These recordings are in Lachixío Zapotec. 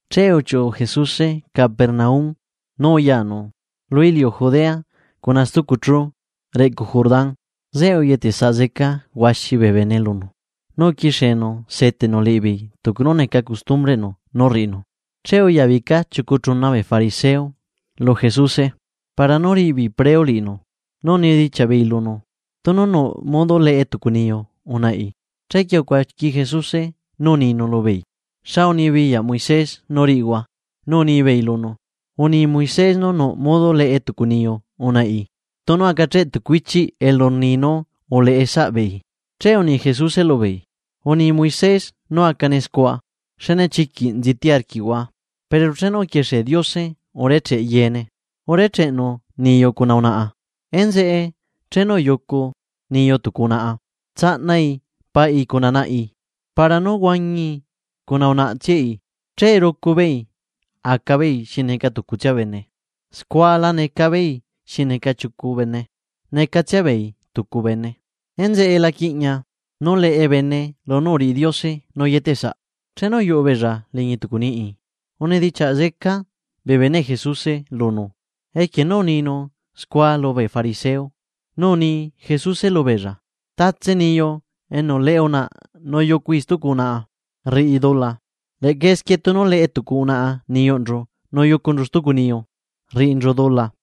Che uchiuꞌu Jesuse Capernaum nu uyanu lu iliu Judea cuna stucu chú reꞌcu Jordán. Zeꞌe uyetesaꞌ zeca huaxi bee bene lunu, nu uquixienu seteꞌnu liꞌibeei tucu nú neca costumbreꞌnu nú rriꞌinu. Che uyabica chiucu chuna bee fariseo lu Jesuse, para nú riꞌi beei preo liꞌinu, nu unidichiaꞌ beei lunu tunu nuꞌ modo leꞌe tucu niyu unaꞌi. Chequie ucuaqui Jesuse nú uninu lubeei: ―¿Xa unibiyaꞌ Moisés nú riꞌihua? Nu unibeei lunu: ―Uni Moisés nú nuꞌ modo leꞌe tucu niyu unaꞌi tunu acacheꞌ tucu ichiꞌ elu rni nú uleꞌe saꞌbeei. Che uni Jesuse lubeei: ―Uni Moisés nú acane scua xne chiquiꞌ nziti arquiꞌhua. Pero chenu uquixie Diose urecheꞌ yeene, “urecheꞌnu niyu cuna unaꞌa”. “Enzeꞌe chenu uyucu niyu tucu unaꞌa tsaꞌnai paꞌi cuna naꞌi, para nú huañii cuna unaꞌtsiai. Che rucu beei aca beei xi neca tucutsia bene.” Scua la neca beei xi neca chiucu bene necatsia beei tucu bene. Enzeꞌe la quiꞌña nú leꞌe bene lunú uriꞌi Diose nú uyetesaꞌ. Chenu uyuꞌu beella liñi tucu niꞌi, unidichiaꞌ zeca bee beneꞌ Jesuse lunu equie nú uninu scua lubee fariseo. Nu uni Jesuse lubeella: ―Tatse niyu enu leꞌe unaꞌa nu yucui stucu unaꞌa, rriꞌi dula. Leꞌca esquie tunu leꞌe tucu unaꞌa niyunchu nu yucunchu stucu niyu, rriꞌinchu dula.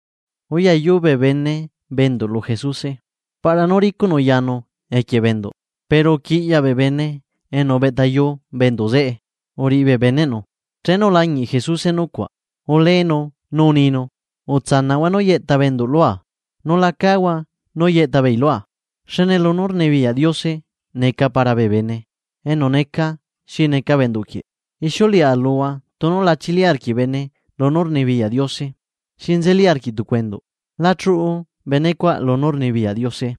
Uyayu bee bene bee enduꞌ lu Jesuse, para nú ricuꞌnu yanu equie bee enduꞌ, pero uquiꞌyaꞌ bee bene enu ubeꞌtayu bee enduꞌ zeꞌe uriꞌi bee beneꞌnu. Chenu ulañiꞌ Jesuse nucuaꞌ, uleenu nu uninu: ―Utsanaꞌhua nú yeꞌta bee enduꞌ lua, nu la cáhua nú yeꞌta beei lua, xne lunú rnibiyaꞌ Diose neca para bee bene enu neca xi neca bee enduꞌ quieꞌ. Ixiuleꞌa luhua tunu la chili arquiꞌ bene lunú rnibiyaꞌ Diose xi nzeli arquiꞌ tucu endu, la chuꞌu bene cuaꞌ lunú rnibiyaꞌ Diose.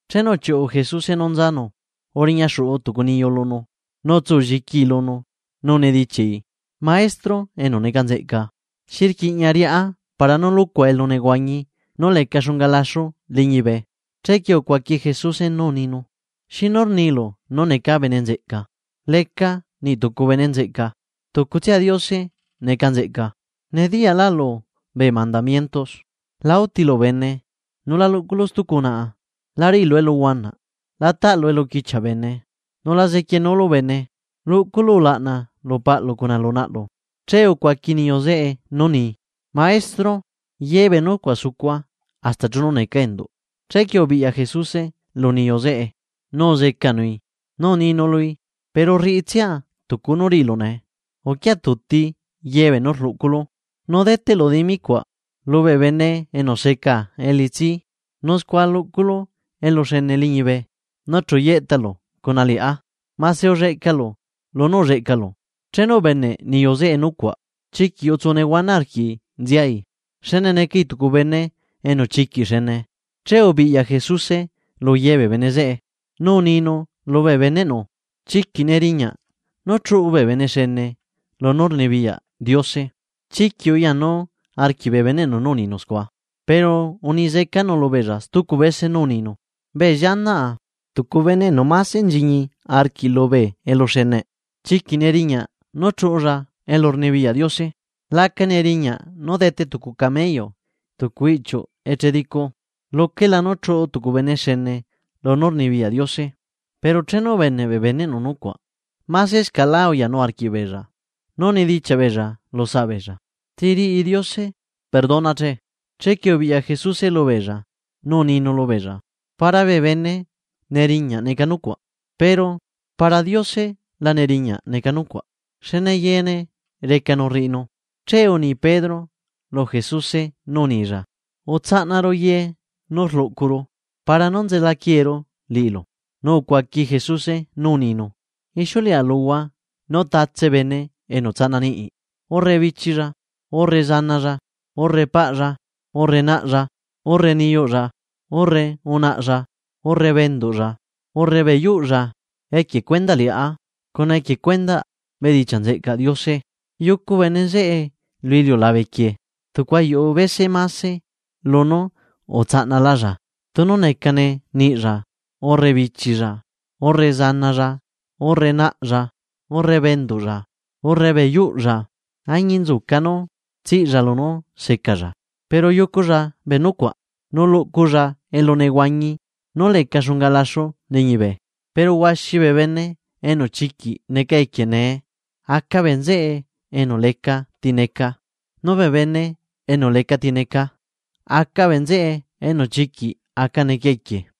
Chenu uchiuꞌu Jesuse nú nzanu, uriña xuꞌu tucu niyu lunu, nu utsulliquii lunu nu unidichiaꞌi: ―Maestro enu neca bene nzeꞌca, ¿xi rquiꞌña riꞌá para nú luꞌcua elunehuañi nú leca xunga laxu liñibe? Chequie ucuaqui Jesuse nú uninu: ―¿Xinu rnilu nú neca bene nzeꞌca? Leca niꞌtucu bene nzeꞌca tucutsia Diose neca bene nzeꞌca. Nediyaꞌlaꞌlu bee mandamiento: “La útilu bene, nu la luꞌculu stucu unaꞌa, la riꞌilu eluhuanaꞌ, la taꞌlu eluquichiaꞌ bene, nu la zequienúlu bene, luꞌculu ulaꞌna lu paꞌlu cuna lu naꞌlu.” Che ucuaqui niyu zeꞌe nú uni: ―Maestro, ye bee nucuaꞌ sucua hasta chenu neca enduꞌ. Chequie ubiꞌya Jesuse lu niyu zeꞌe nu uzecanui, nu uninu lui: ―Pero rriꞌitsia tucu nú riꞌilu nee, uquia tuti ye beenú rluꞌculu nu deteꞌlu dimi cuaꞌ lubee bene enu seca elitsi. Nu scua luꞌculu eluxene liñibe. Nu chu yeꞌtalu cuna liꞌá mase ulleꞌcalu lunú ulleꞌcalu. Chenu ubeneꞌ niyu zeꞌe nucuaꞌ, chiquiꞌ utsu nehuana arquiꞌi nziai, xne necai tucu bene enu chiquiꞌ xene. Che ubiꞌya Jesuse luye bee bene zeꞌe, nu uninu lubee beneꞌnu: ―¡Chiquiꞌ neriñá nú chuꞌu bee bene xene lunú rnibiyaꞌ Diose! Chiquiꞌ uyanu arquiꞌ bee beneꞌnu nu uninu scua, pero uni zecanu lubeella stucu bese nú uninu: ―Bee llianaꞌa, ¡tucu bene enu mase nchiñi arquiꞌ lubee eluxeneꞌ, chiquiꞌ neriñaꞌ nú chuꞌulla lunú rnibiyaꞌ Diose! La aca neriñaꞌ nú dete tucu camello tucu iꞌchiuꞌ eche dicu, luquela nú chuꞌu tucu bene xene lunú rnibiyaꞌ Diose. Pero chenu ubeneꞌ bee beneꞌnu nucuaꞌ, masescaꞌlá uyanu arquiꞌbeella, nu unidichiaꞌ beella lu saꞌbeella: ―¿Ti riꞌi Diose perdona, che? Chequie ubiꞌya Jesuse lubeella nu uninu lubeella: ―Para bee bene neriñaꞌ neca nucuaꞌ, pero para Diose la neriñaꞌ neca nucuaꞌ, xne yeene recanu rriꞌinu. Che uni Pedro lu Jesuse nú unilla: ―Utsaꞌnaru ye nú rluꞌcuru, para nú nzela quieeru liꞌilu. Nu ucuaqui Jesuse nú uninu: ―Ixiuleꞌa luhua nú tatse bene enu tsaꞌna niꞌi, urre bichilla, urre zanalla, urre paꞌlla, urre naꞌlla, urre niyuꞌlla, urre unaꞌlla, urre bee enduꞌlla, urre bee yuꞌlla, equie cuendaꞌ liꞌá cuna equie cuendaꞌ bedichiaꞌ nzeꞌcaꞌ Diose, yucu bene zeꞌe lu iliulabe quieꞌ tucu ayuꞌu bese mase lunú utsaꞌnalalla, tunu necane niꞌlla, urre bichilla, urre zanalla, urre naꞌlla, urre bee enduꞌlla, urre bee yuꞌlla, añinzuca nú tsiꞌlla lunú zecalla, pero yuculla bee nucuaꞌ nu luꞌculla elunehuañi nú leca xunga laxu liñibe. Pero huaxi bee bene enu chiquiꞌ neca equie nee, aca bee nzeꞌe enu lecati neca, nu bee bene enu lecati neca, aca bee nzeꞌe enu chiquiꞌ aca neca equie.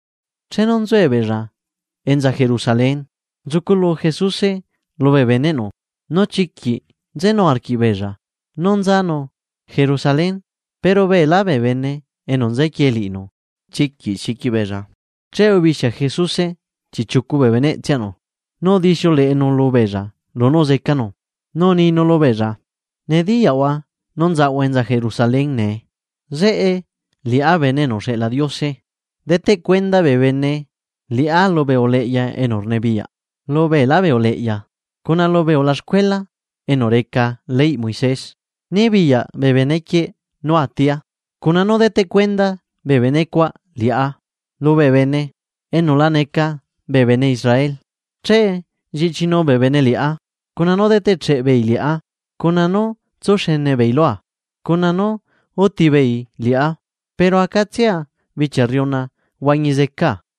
Chenu nzuebeella enza Jerusalén, nzuculu Jesuse lubee beneꞌnu. Nu chiquiꞌ nzenu arquiꞌbeella, nú nzanu Jerusalén, pero beelá bee bene enu nzequie liꞌinu, chiquiꞌ xiqui beella. Che ubixia Jesuse chiꞌchiucu bee beneꞌtsianu, nu udixiuleꞌenu lubeella lunú zecanu. Nu uninu lubeella: ―Nediyaꞌhua nú nzaꞌahua enza Jerusalén nee, zeꞌe liꞌá Bene enu uxeꞌla Diose deteꞌ cuenda bee bene liꞌá lubee uleꞌya enu rnibiyaꞌ lu beelá bee uleꞌya, cuna lubee ulaxcuela enu reca leyꞌ Moisés nu nibiyaꞌ bee benequieꞌ nú atia, cuna nú deteꞌ cuenda bee bene cuaꞌ liꞌá lubee bene enu la neca bee bene Israel. Che lliꞌchinu bee bene liꞌá, cuna nú zeteꞌcheꞌ beei liꞌá, cuna nú tsuxene beei lua, cuna nú úti beei liꞌá, pero acatsia bichia rriuna huañi zecaa.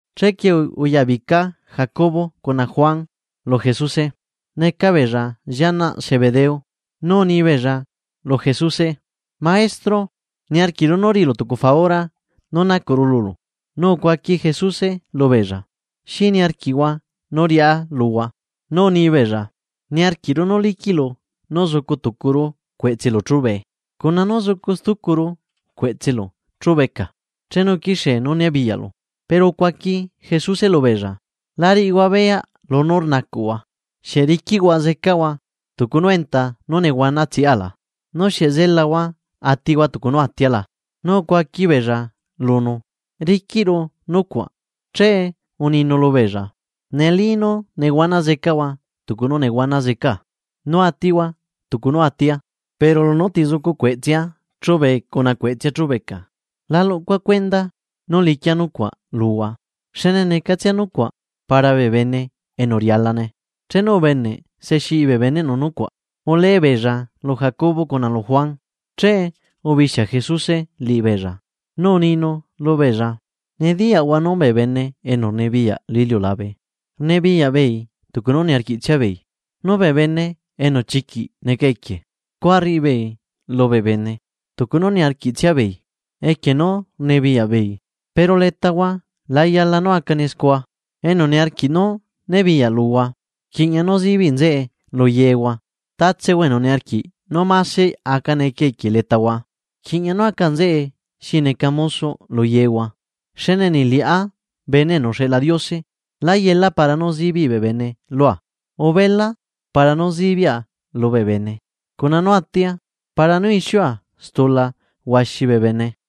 Chequie uyabica Jacobo cuna Juan lu Jesuse, neca beella llianaꞌ Zebedeo, nu unibeella lu Jesuse: ―Maestro, niarquiꞌru nú riꞌilu tucu faura nú nacuꞌru lulu. Nu ucuaqui Jesuse lubeella: ―¿Xi niarquiꞌhua nú riꞌá luhua? Nu uni beella: ―Niarquiꞌru nú liquiꞌlu nú zucu tucuru cueꞌtselu chubee cuna nú zucu stucuru cueꞌtselu chubeca chenu quixie nú nibiyaꞌlu. Pero ucuaqui Jesuse lubeella: ―La riꞌihua beyaꞌ lunú rnacuꞌhua. ¿Xieꞌ riquiꞌhua nehuana zecahua tucu nú nehuana zeca la? ¿Nu xieꞌ zelahua atihua tucu nú atia la? Nu ucuaqui beella lunu: ―Riquiꞌru nucuaꞌ. Che uninu lubeella: ―Neli nú nehuana zecahua tucu nú nehuana zecaa nu atihua tucu nú atia. Pero lunú ti zucu cueꞌtsea chúbee cuna cueꞌtsea chúbeca la luꞌcua cuendaa nú liquia nucuaꞌ luhua, xne necatsia nucuaꞌ para bee bene enu rialane. Chenu ubeneꞌ se xiꞌi bee beneꞌnu nucuaꞌ, ulee beella lu Jacobo cuna lu Juan. Che ubixia Jesuse liꞌibeella, nu uninu lubeella: ―Nediyaꞌhua nú bee bene enu rnibiyaꞌ lu iliulabe rnibiyaꞌ beei tucu nú niarquiꞌtsia beei, nu bee bene enu chiquiꞌ neca equie scua rriꞌi beei lubee bene tucu nú niarquiꞌtsia beei, equie nú rnibiyaꞌ beei. Pero letahua la yala nú acane scua. Enu niarquiꞌ nú nibiyaꞌ luhua, rquiꞌña nú zibiꞌ nzeꞌe lu yehua. Tatsehua enu niarquiꞌ nú mase aca neca equie letahua, rquiꞌña nú aca nzeꞌe xi neca musoꞌ lu yehua. Xne niꞌ liꞌá Bene enu uxeꞌla Diose né yela para nú zibiꞌ bee bene lua, ubela para nú zibiaꞌa lubee bene cuna nú atia para nú ixiua stula huaxi bee bene.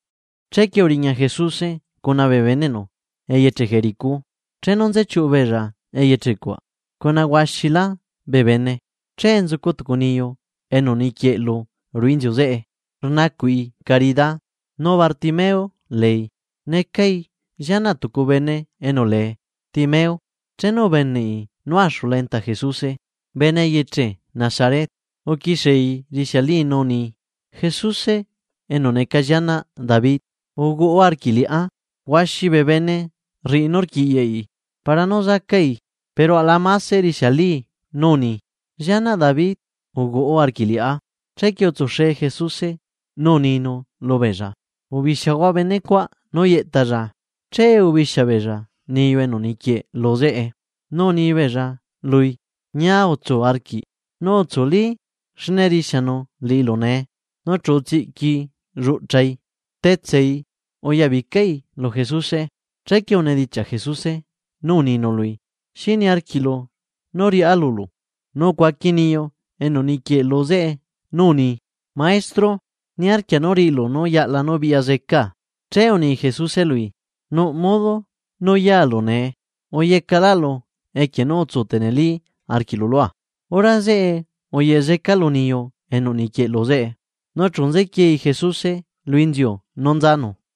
Chequie uriña Jesuse cuna bee beneꞌnu eyeche Jericó. Chenu nzechiuꞌu beella eyeche cuaꞌ, cuna huaxilá bee bene, che nzucu tucu niyu enu niquieꞌlu ruꞌu inziu zeꞌe rnacuꞌi carida nu Bartimeo leei, necai llianaꞌ tucu bene enu lee Timeo. Chenu ubeneꞌi nú axula enta Jesuse bene eyeche Nazaret, uquixiei urixialii nú uni: ―¡Jesuse enu neca llianaꞌ David, uhuaꞌa arquiꞌ liꞌá! Huaxi bee bene rriꞌi nú rquiꞌyaꞌi para nú zacai, pero aꞌla mase rixialii nú uni: ―¡Llianaꞌ David, uhuaꞌa arquiꞌ liꞌá! Chequie utsuxe Jesuse, nu uninu lubeella: ―Ubixiahua benecuaꞌ nú yeꞌtalla. Che ubixia beella niyu enu niquieꞌe lu zeꞌe, nu unibeella lui: ―Ñia utsu arquiꞌ, nu utsuli, xne rixianu liꞌilu nee. Nu chu utsiꞌquii lluꞌchai, rtetsai uyabicai lu Jesuse. Chequie unidichiaꞌ Jesuse nú uninu lui: ―¿Xi niarquiꞌlu nú riꞌá lulu? Nu ucuaqui niyu enu niquieꞌlu zeꞌe nú uni: ―Maestro, niarquia nú riꞌilu nú yaꞌla nú biꞌya zecaa. Che uni Jesuse lui: ―Nuꞌ modo nú yalu nee, uyecaꞌlaꞌlu equie nú utsu tenelí arquiꞌlu lua. Hora zeꞌe uyeꞌe lu niyu enu niquieꞌlu zeꞌe, nu chu nzequiei Jesuse lu inziu nú nzanu.